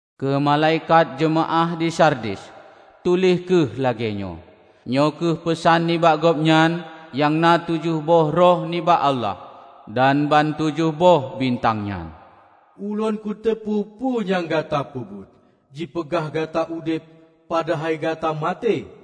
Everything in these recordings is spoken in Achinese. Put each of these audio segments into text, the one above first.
"Keu malaikat jeumaáh di Sardis, tuléh kheueh lagée nyoe: Nyoe kheueh peusan nibak Gobnyan nyang na tujoh boh roh nibak Allah dan ban tujoh boh bintang nyan. Ulôn kuteupeue peue nyang gata peubuet. Jipeugah gata udeb, padahai gata maté!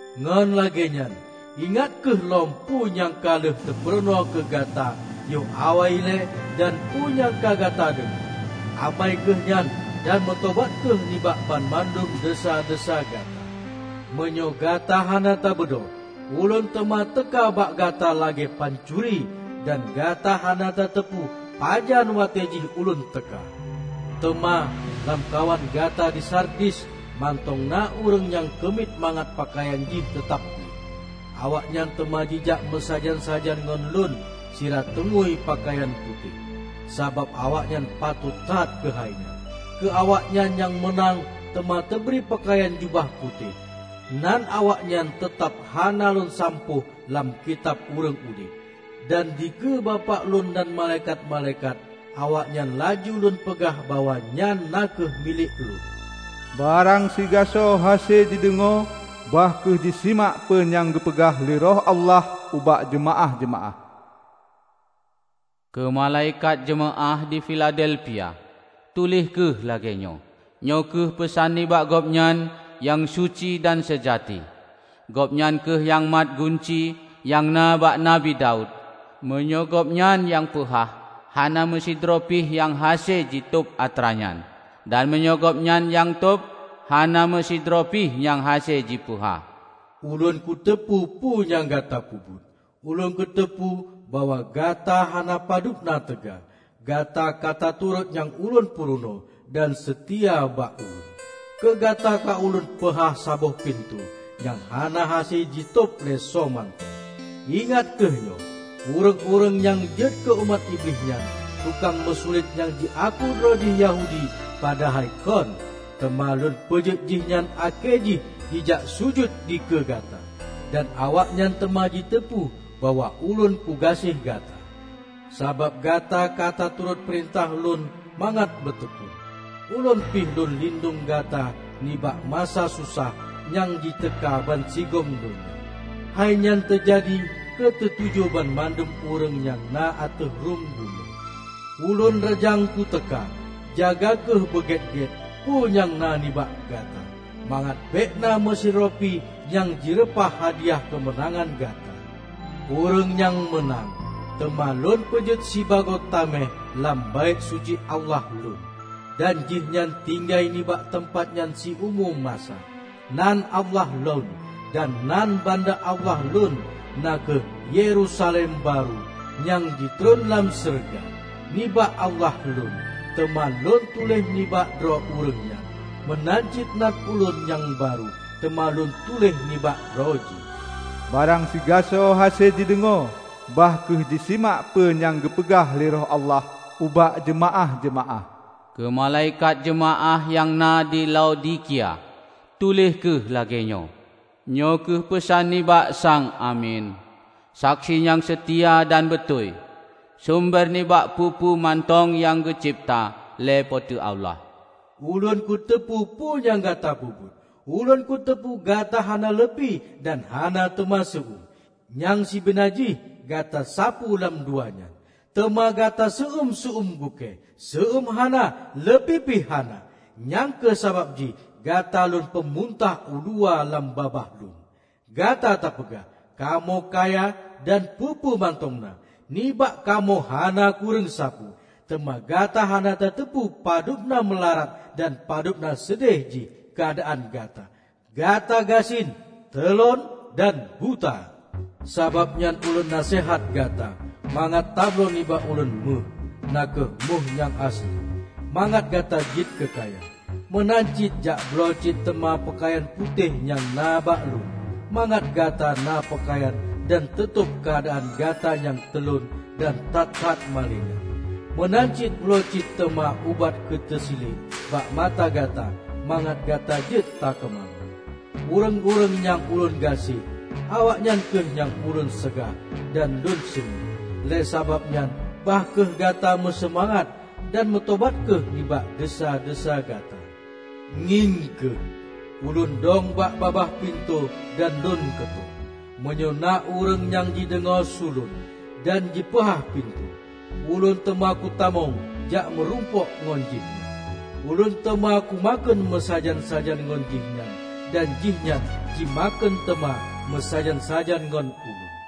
Ngon lagée nyan, ingat kheueh lom peue nyang ka lheueh teupurunoe keu gata yoh awai ilée dan peue nyang ka gata deungoe. Amai kheueh nyan dan meutobat kheueh nibak banmandum desya-desya gata. Meunyoe gata hana tabeudôh, Ulôn teuma teuka bak gata lagée pancuri; dan gata hana tateupeu pajan watée jih Ulôn teuka. Teuma lamkawan gata di Sardis mantong na ureuëng nyang keumiet mangat peukayan jih teutab gleh. Awaknyan teuma jijak meusajan-sajan ngon Lôn sira teungui peukayan putéh, sabab awaknyan patot that keuhai nyan. Keu awaknyan nyang meunang teuma teubri peukayan jubah putéh. Nan awaknyan teutab hana Lôn sampoh lam Kitab Ureuëng Udeb. Dan dikeue Bapak Lôn dan malaikat-malaikat, awaknyan laju Lôn peugah bahwa nyan na kheueh milék Lôn. Barang sigasoe hase jideungoe, bah kheueh jisimak peue nyang geupeugah lé Roh Allah ubak jeumaáh-jeumaáh!" "Keu malaikat jeumaáh di Filadelfia, tuléh kheueh lagée nyoe: Nyoe kheueh peusan nibak Gobnyan nyang suci dan seujati. Gobnyan kheueh nyang mat gunci nyang na bak Nabi Daud; meunyoe Gobnyan nyang peuhah, hana meusidroe pih nyang hase jitôb atra nyan, dan meunyoe Gobnyan nyang tôb, hana meusidroe pih nyang hase jipeuhah. Ulôn kuteupeue peue nyang gata peubuet. Ulôn kuteupeue bahwa gata hana padub na teuga; gata ka taturot nyang Ulôn purunoe dan seutia bak Ulôn. Keugata ka Ulôn peuhah saboh pintoe, nyang hana hase jitôb lé soe mantong. Ingat kheueh nyoe: Ureuëng-ureuëng nyang jeuet keu umat Iblih nyan, tukang meusulet nyang jiaku droe jih Yahudi padahai kon, teuma Lôn peujeuet jihnyan akhé jih jijak sujut dikeue gata. Dan awaknyan teuma jiteupeue bahwa Ulôn kugaséh gata. Sabab gata ka taturot peurintah Lôn mangat beuteukon, Ulôn pih Lôn lindong gata nibak masa susah nyang jiteuka bansigom donya. Hai nyan teujadi keu teu-ujoe banmandum ureuëng nyang na ateueh rhueng bumoe. Ulôn reujang kuteuka! Jaga kheueh beugét-gét peue nyang na nibak gata, mangat bék na meusidroe pi nyang jireupah hadiah keumeunangan gata. Ureuëng nyang meunang, teuma Lôn peujeuet sibagoe taméh lam Baét Suci Allah Lôn, dan jihnyan tinggai nibak teumpat nyan siumu masa. Nan Allah Lôn, dan nan banda Allah Lôn -- na kheueh Yerusalem barô nyang jitreun lam syeuruga, nibak Allah Lôn -- teuma Lôn tuléh nibak droe ureuëng nyan. Meunan cit nan Ulôn nyang barô teuma Lôn tuléh nibak droe jih. Barang sigasoe hase jideungoe, bah kheueh jisimak peue nyang geupeugah lé Roh Allah ubak jeumaáh-jeumaáh!" "Keu malaikat jeumaáh nyang na di Laodikia, tuléh kheueh lagée nyoe: Nyoe kheueh peusan nibak Sang Amin, Saksi nyang seutia dan beutôi, sumber nibak peue-peue mantong nyang geucebta lé Po teu Allah. Ulôn kuteupeue peue nyang gata peubuet; Ulôn kuteupeue gata hana leupie dan hana teuma seu-uem. Nyang sibeuna jih gata sapeue lam dua nyan! Teuma gata seu-uem seu-uem gukée; seu-uem hana, leupie pih hana. Nyang kheueh sabab jih gata Lôn peumuntah uluwa lam babah Lôn. Gata tapeugah, 'Kamoe kaya dan peue-peue mantong na; nibak kamoe hana kureueng sapeue.' Teuma gata hana tateupeu padub na meularat dan padub na seudeh jih keuadaan gata! Gata gasien, teulon dan buta. Sabab nyan Ulôn naseuhat gata mangat tabloe nibak Ulôn méuh, na kheueh méuh nyang aseuli, mangat gata jeuet keukaya. Meunan cit jakbloe cit teuma peukayan putéh nyang na bak Lôn mangat gata na peukayan dan teutôb keuadaan gata nyang teulon dan that-that malée nyan. Meunan cit bloe cit teuma ubat keuteu siliek bak mata gata mangat gata jeuet takeumalon. Ureuëng-ureuëng nyang Ulôn gaséh, awaknyan kheueh nyang Ulôn seugah dan Lôn seunuét. Lé sabab nyan bah kheueh gata meuseumangat, dan meutobat kheueh nibak desya-desya gata. Ngieng kheueh! Ulôn dong bak babah pintoe dan Lôn keutok. Meunyoe na ureuëng nyang jideungoe su Lôn, dan jipeuhah pintoe, Ulôn teuma kutamong jak meurumpok ngon jihnyan; Ulôn teuma ku makheun meusajan-sajan ngon jih nyan dan jih nyan jimakheun teuma meusajan-sajan ngon Ulôn.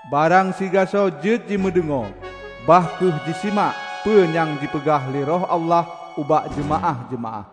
Barang sigasoe jeuet jimeudeungoe, bah kheueh jisimak peue nyang jipeugah lé Roh Allah ubak jeumaáh-jeumaáh!"